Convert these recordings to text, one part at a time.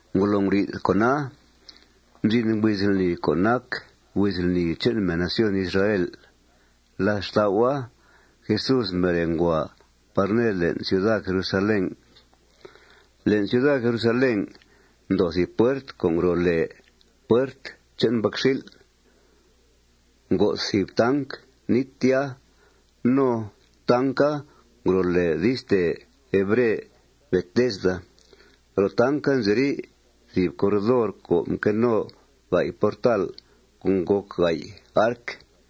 Ngolo nguri'th con'a, mzin huiz lni co' nac huiz lni che'n mèn nación Israel. Làth xtau'a, Jesús mbere ngua par ned le'n ciuda Jerusalén. Le'n ciuda Jerusalén, ndoo thìb puert co' ngro' lèe Puert che'n Mbacxil'. Ngo'th thìb tanc nít tya. No tanca ngro' lèe di'stèe hebre Betesda. Ro tanca nziri' thìb corredor co' mque no ga'y portal co' ngòc ga'y arc.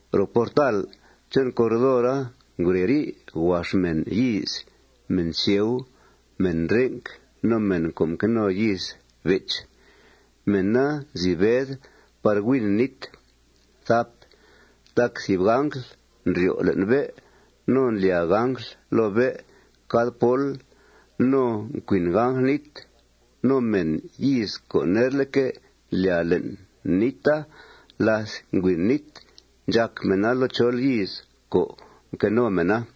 Ro portal che'n corredora ngureri' huax mèn yíiz, mèn sieu, mèn renc, no mèn co' mque no yíiz bech. Mèna nzi bed par huin nít. Tac thìb angl ndryo' le'n bé' no ndlyàa angl loo bé' cad pól no ncuin angl nít. No mèn yíiz co' nerleque' ndlyàa le'n níta láth ngüin nít, ndxac mèna loo chol yíiz co' mque no mèna.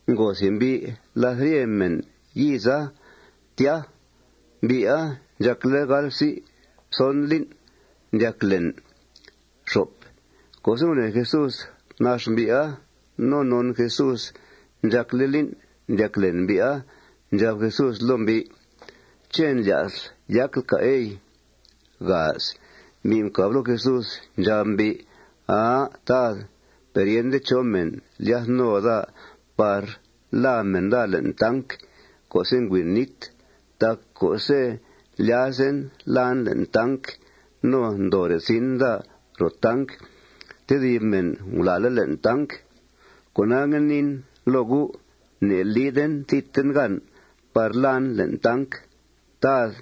Ngo thìb mbi' làth rye mèn yíiza tya. Mbi'a ndxàcle' gal psi' pxon lín' ndyac len. Co'se' gunèe Jesús nax mbi'a no non Jesús ndxàcle' lín' ndyac len mbi'a, ndxab Jesús loo mbi': ―¿Ché' ndlya'sl yacl, cà', ey? Mbi' mcàb loo Jesús. Ndxab mbi': ―Aa, Tad, per yende chó mèn lyath no daa par làa mèn daa le'n tanc co'se' ngüin nít. Tac co'se' ndlyazen làan le'n tanc, no ndoore' zin daa ro tanc, tedib mèn ngulàale' le'n tanc. Cona, ngue niin loo U': Ne'lide thidten gan par làan le'n tanc, Tad.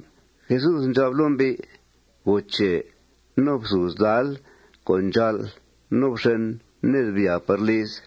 Jesús ndxab loo mbi': ―Goo che. No fthùuz dáal co' ndxàa'l. No fxen ned. Byàa par lizl.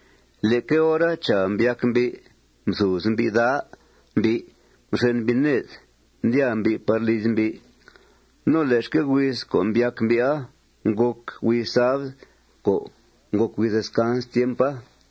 Leque hora, chàa, mbyac mbi'. Mthùuz mbi' dáa mbi'. Mxen mbi' ned. Ndyàa mbi' par liz mbi'. No le'xque' huiz co' mbyac mbi'a ngòc huiz sabd co' ngòc huiz descans tiempa.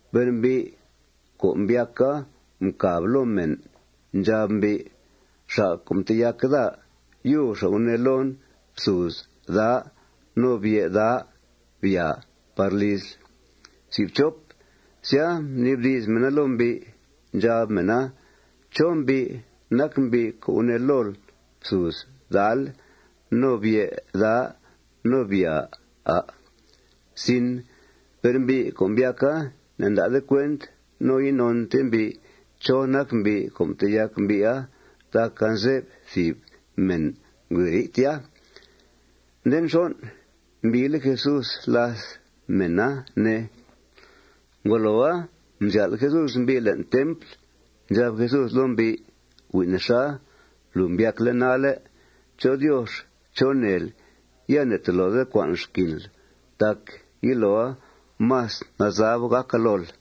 Per mbi' co' mbyaca mcàb loo mèna. Ndxab mbi': ―Xa' co' mteyac daa, yub xa' gunee loon: Fthùuz dáa. No bye' dáa. Byàa par lizl. Sya, mnibdi's mèna loo mbi'. Ndxab mèna: ―¿Chó mbi' nac mbi' co' gunee lool: Fthùuz dáal no bye' dáa no byàa, à'? Per mbi' co' mbyaca ne'nda'de cuent no inonte mbi' chó nac mbi' co' mteyac mbi'a tac anze'f thìb mèn ngureri' tya. Nde nxon', mbiile' Jesús làth mèna, ne. Ngoloa, mzyál' Jesús mbi' le'n templ. Ndxab Jesús loo mbi': ―Hui' nexa. Lùu mbyacle' nalle'. Chó Diox chó neel. Ya ne'tolode cua'nl xquinl. Tac yiloa más nazab gàca lool.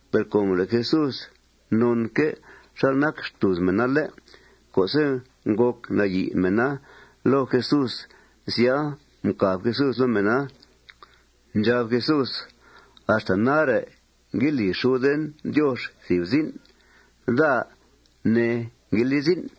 Per com le' Jesús nonque' xal nac xtùuz mèna, ¿lé'?, co'se' ngòc nayi' mèna loo Jesús, sya, mcàb Jesús loo mèna. Ndxab Jesús: ―Axta nare' ngue li xuden Diox thìb zin'. Daa, ne, ngue li zin'.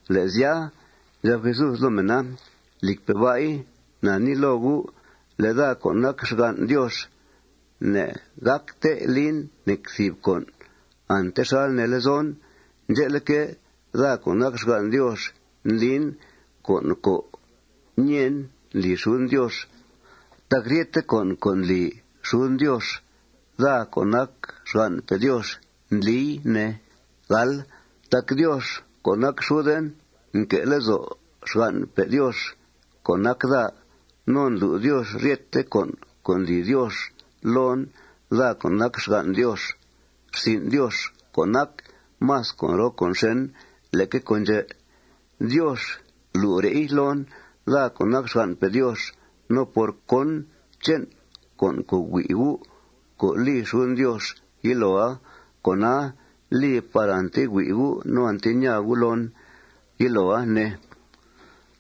Le' sya, ndxab Jesús loo mèna: ―Lìcpe' ba'i, na nii loo gu': Le' daa, co' nac xgan' Diox, ne'gácte lin nec thìb con' ante xal nee lezon. Ndxe'leque', daa co' nac xgan' Diox, ndlin con' co' ñèen ndli xuden Diox. Tac ryete con' co' ndli xuden Diox, daa co' nac xgan'pe' Diox ndlii, ne. Tac Diox co' nac xuden nque' lezo' xgan'pe' Diox co' nac daa. No ndlu' Diox ryete con' co' ndli Diox loon, daa co' nac xgan' Diox. Rsin' Diox co' nac más con' roo con' xèn leque con' ndxè', Diox lu're'i loon, daa co' nac xgan'pe' Diox. No por cón che'n con' co' hui' gu' co' li xuden Diox yiloa, con'a li par ante hui' gu' no ante ñaa gu' loon yiloa, ne.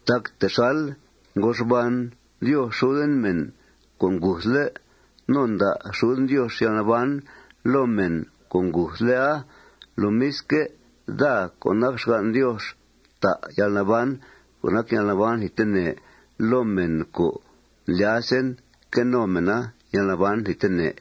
Tac texal ngo xban Diox xuden mèn co' nguthle', no nda' xuden Diox yalnaban loo mèn co' nguthle'a, lomisque', daa co' nac xgan' Diox ta yalnaban co' nac yalnaban thidtene loo mèn co' ndlyazen que no mèna yalnaban thidtene.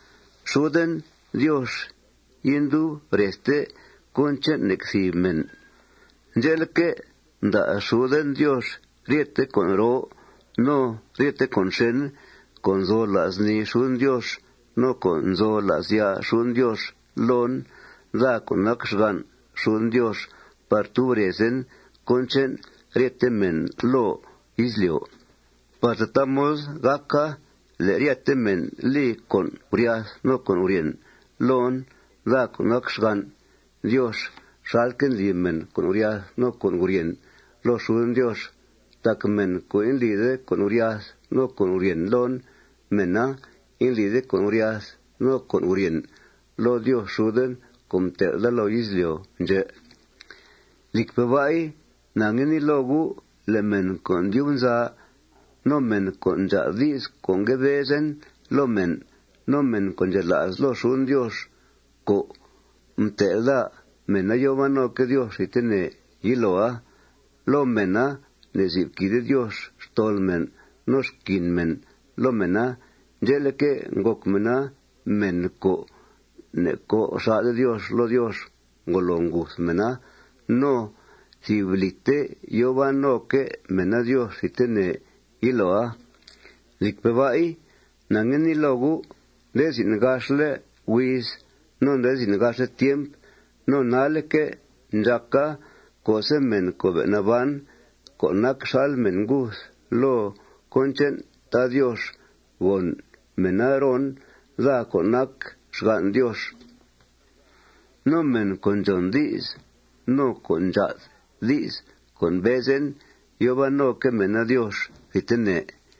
Xuden Diox indub rezte cón che'n nec thìb mèn. Ndxe'leque', mda' xuden Diox ryete con' roo no ryete con' xèn co' nzo la's nii xuden Diox no co' nzo la's ya' xuden Diox loon, daa co' nac xgan' xuden Diox par tub rezen cón che'n ryete mèn loo izlyo', par tataa mod gàca le' ryete mèn li con' guryath no con' guryèn loon, daa co' nac xgan' Diox, xalque' ndli mèn con' guryath no con' guryèn loo xuden Diox. Tac mèn co' indlide con' guryath no con' guryèn loon, mèna indlide con' guryath no con' guryèn loo Diox xuden co' mtel' daa loo izlyo' ndxè'. Lìcpe' ba'i, na ngue nii loo gu': Le' mèn co' ndyub nza no mèn co' ndxàa'd di's co' ngue bezen loo mèn no mèn co' ndxela's loo xuden Diox co' mtel' daa, mèna yòo ban noque' Diox thidtene yiloa. Loo mèna ne'zib quìide Diox xtol mèn no xquin mèn loo mèna. Ndxe'leque', ngòc mèna mèn co' ne'co' xà'de Diox loo Diox ngolo nguth mèna. No thìb lìte yòo ban noque' mèna Diox thidtene yiloa. Lìcpe' ba'i, na ngue nii loo gu': Nde zin' gaxle' huiz no nde zin' gaxle' tiemp no nalle'que' ndxàca co'se' mèn co' be' naban co' nac xal mèn nguth loo cón che'n Tad Diox, gòn mèna ron, daa co' nac xgan' Diox. No mèn co' ndxòn di's no co' ndxàa'd di's co' mbezen, yòo ban noque' mèna Diox thidtene.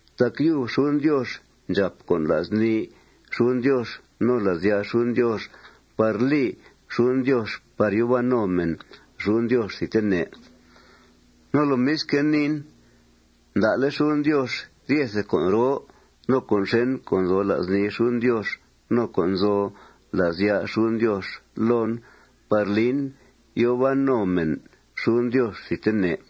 Tac yub xuden Diox ndxàp con' la's nii xuden Diox no la's ya' xuden Diox par li xuden Diox par yòo ban no mèn xuden Diox thidtene. No lomisque', niin: Mda'le' xuden Diox ryethe con' roo no con' xèn co' nzo la's nii xuden Diox no co' nzo la's ya' xuden Diox loon par lin yòo ban no mèn xuden Diox thidtene.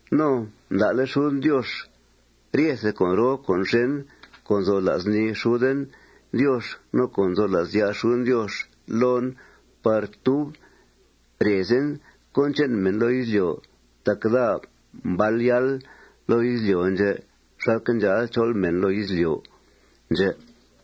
No mda'le' xuden Diox ryethe con' roo con' xèn co' nzo la's nii xuden Diox no co' nzo la's ya' xuden Diox loon par tub rezen cón che'n mèn loo izlyo' tac daa mbal yáal loo izlyo' ndxè' xalque' ndxáal chol mèn loo izlyo' ndxè'.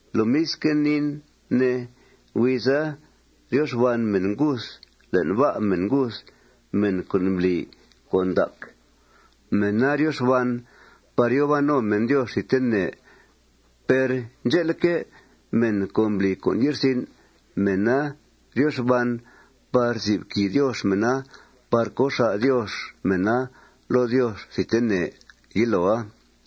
Lomisque' niin, ne: Huiza, ryo xban mèn nguth le'n bá' mèn nguth. Mèn co' mbli con' ndac, mèna ryo xban par yòo ban no mèn Diox thidtene. Per ndxe'leque', mèn co' mbli con' ye'rsin', mèna ryo xban par zib quìi Diox mèna par co' xà' Diox mèna loo Diox thidtene yiloa.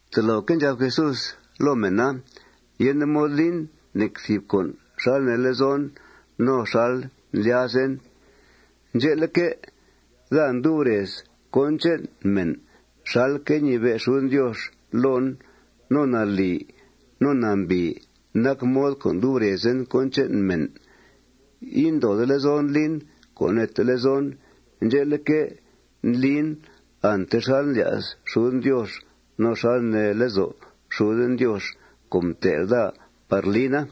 Toloque' ndxab Jesús loo mèn: ―Yende mod lin nec thìb con' xal nee lezon no xal ndlyazen. Ndxe'leque', daa ndub rez cón che'n mèn xalque' ñibe' xuden Diox loon. No nalì no nambìi nac mod co' ndub rezen cón che'n mèn. Indoode lezon lin co' neete lezon. Ndxe'leque', ndlin ante xal ndlya's xuden Diox no xal nee lezo' xuden Diox co' mtel' daa par lina.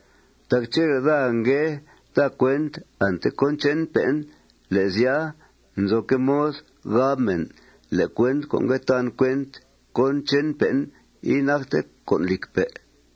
Tac chele' daa ngue ta cuent ante cón che'npe'en, le' sya, nzoque' mod gab mèn le' cuent co' ngue tan cuent cón che'npe'en, inacte con' lìcpe'.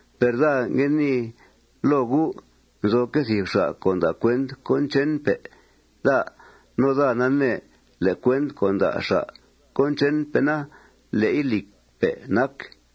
Per daa ngue nii loo gu': Nzoque' thìb xa' co' nda' cuent cón che'npe' daa. No daa nanee le' cuent co' nda' xa' cón che'npe'ena, le'i lìcpe' nac.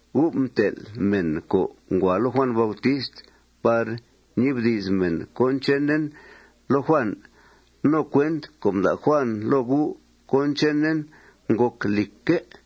Gu' mtel' mèn co' ngua loo Juàn Bautist par ñibdi's mèn cón chenen loo Juàn. No cuent co' mda' Juàn loo gu' cón chenen ngòc lìcque'.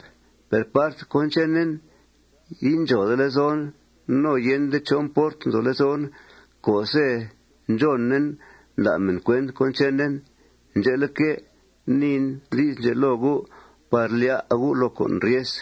Per part cón chenen, indxòode lezon no yende chó mport nzo lezon co'se' ndxònen nda' mèn cuent cón chenen. Ndxe'leque', niin di's ndxè' loo gu' par lyá' gu' loo con' ryes.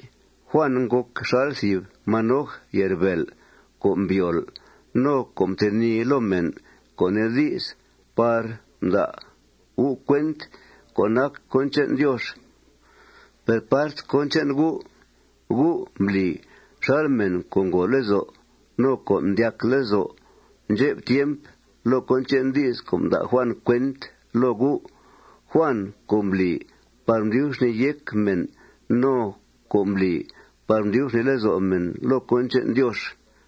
Juàn ngòc xal thìb manoj ye'rbèel co' mbyol no co' mtenìi loo mèn, co' nee di's, par mda' gu' cuent co' nac cón che'n Diox. Per part cón che'n gu', gu' mbli xal mèn co' ngòo lezo' no co' mdyac lezo' ndxep tiemp loo cón che'n di's co' mda' Juàn cuent loo gu', Juàn co' mbli par mdyub xnìi yéc mèn no co' mbli par mdyub xnìi lezo' mèn loo cón che'n Diox.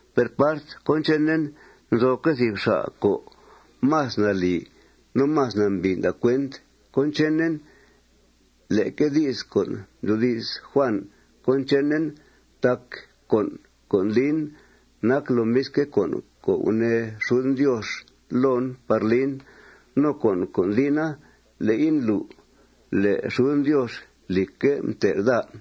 Per part cón chenen, nzoque' thìb xa' co' más nalì no más nambìi nda' cuent cón chenen leque di's co' mdyoodi's Juàn cón chenen. Tac con' co' ndlin nac lomisque' con' co' gunee xuden Diox loon par lin. No con' co' ndlina, le'i ndlu' le' xuden Diox, lìcque', mtel' daa.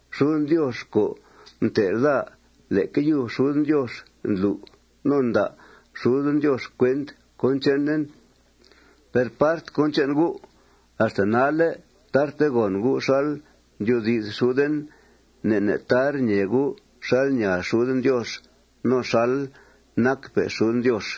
Xuden Diox co' mtel' daa, leque yub xuden Diox ndlu' no nda' xuden Diox cuent cón chenen. Per part cón che'n gu', axta nalle' tarte gòn gu' xal ndyoodi's xuden. Ne' ne' tar ñee gu' xal ñaa xuden Diox no xal nacpe' xuden Diox.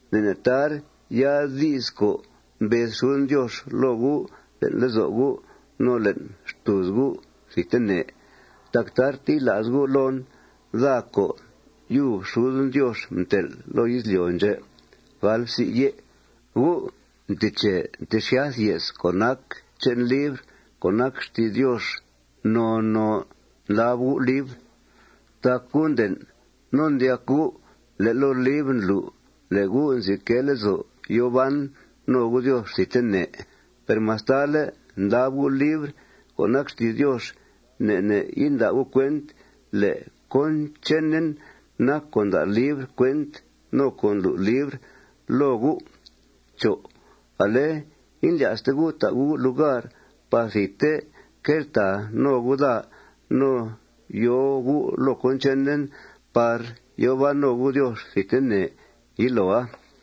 Ne' ne' tar yaa'd di's co' mbez xuden Diox loo gu' le'n lezo' gu' no le'n xtùuz gu' thidtene. Tac tarte yila's gu' loon, daa co' yub xuden Diox mtel' loo izlyo' ndxè'. Gu' nteche ntexyath ye's co' nac che'n libr co' nac xti's Diox. Noo noo ndlab gu' libr. Tac gu' nden' no ndyac gu' le' loo libra ndlu' le' gu' nzi quee lezo' yòo ban no gu' Diox thidtene. Per mastale' ndlab gu' libr co' nac xti's Diox, ne' ne' inda' gu' cuent le' cón chenen nac co' nda' libr cuent no co' ndlu' libr loo gu'. No ale indlya'ste gu' ta' gu' lugar par thidte queltàa no gu' daa no yòo gu' loo cón chenen par yòo ban no gu' Diox thidtene yiloa.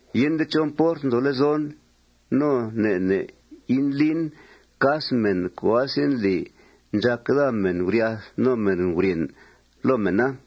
Yende chó mport nzo lezon no ne' ne' indlin cas mèn co' asendli ndxàc daa mèn guryath no mèn guryèn loo mèna.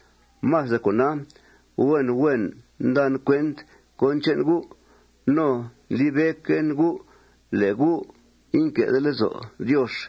Más de cona, huen huen ndan cuent cón che'n gu'. No ndlibe'quen gu' le' gu' inque'de lezo' Diox.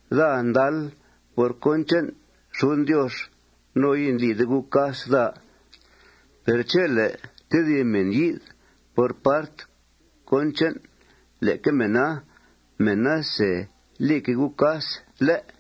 Daa ndal por cón che'n xuden Diox. No indlide gu' cas daa. Per chele' tedib mèn yi'th por part cón che'n leque mèna, mèna se lique' gu' cas, ¿lé'?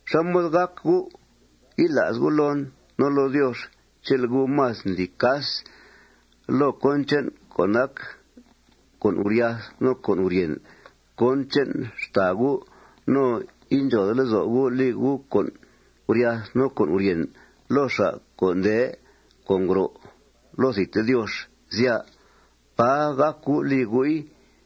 ¿Xá mod gác gu' yila's gu' loon no loo Diox chele' gu' más ndli cas loo con' co' nac con' guryath no con' guryèn cón che'n xtàa gu' no indxòode lezo' gu' li gu' con' guryath no con' guryèn loo xa' co' nde no co' ngro' loo thidte Diox, sya? ¡Pà gác gu' li gu'i!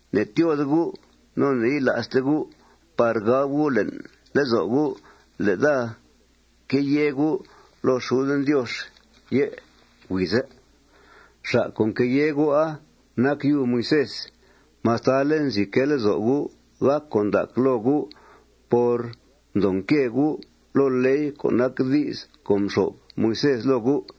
Ne'tyóode gu' no ne'yila'ste gu' par gab gu' le'n lezo' gu' le' daa queyèe gu' loo xuden Diox yé' huize'. Xa' co' nqueyèe gu'a nac yub Moisés, mastale' nzi quee lezo' gu' gàc con' ndac loo gu' por mdoo nque gu' loo ley co' nac di's co' mxo'f Moisés loo gu'.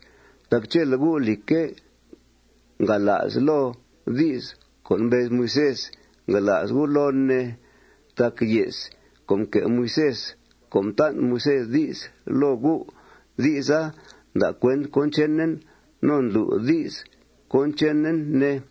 Tac chele' gu', lìcque', ngala's loo di's co' mbez Moisés, ngala's gu' loon, ne. Tac ye's co' mque' Moisés co' mtan' Moisés di's loo gu', di'sa nda' cuent cón chenen no ndlu' di's cón chenen, ne.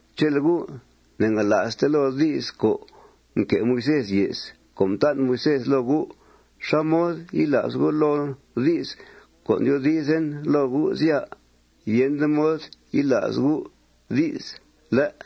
Chele' gu' ne'ngala'ste loo di's co' mque' Moisés ye's co' mtan' Moisés loo gu', ¿xá mod yila's gu' loo di's co' ndyoodizen loo gu', sya? Yende mod yila's gu' di's, ¿lé'?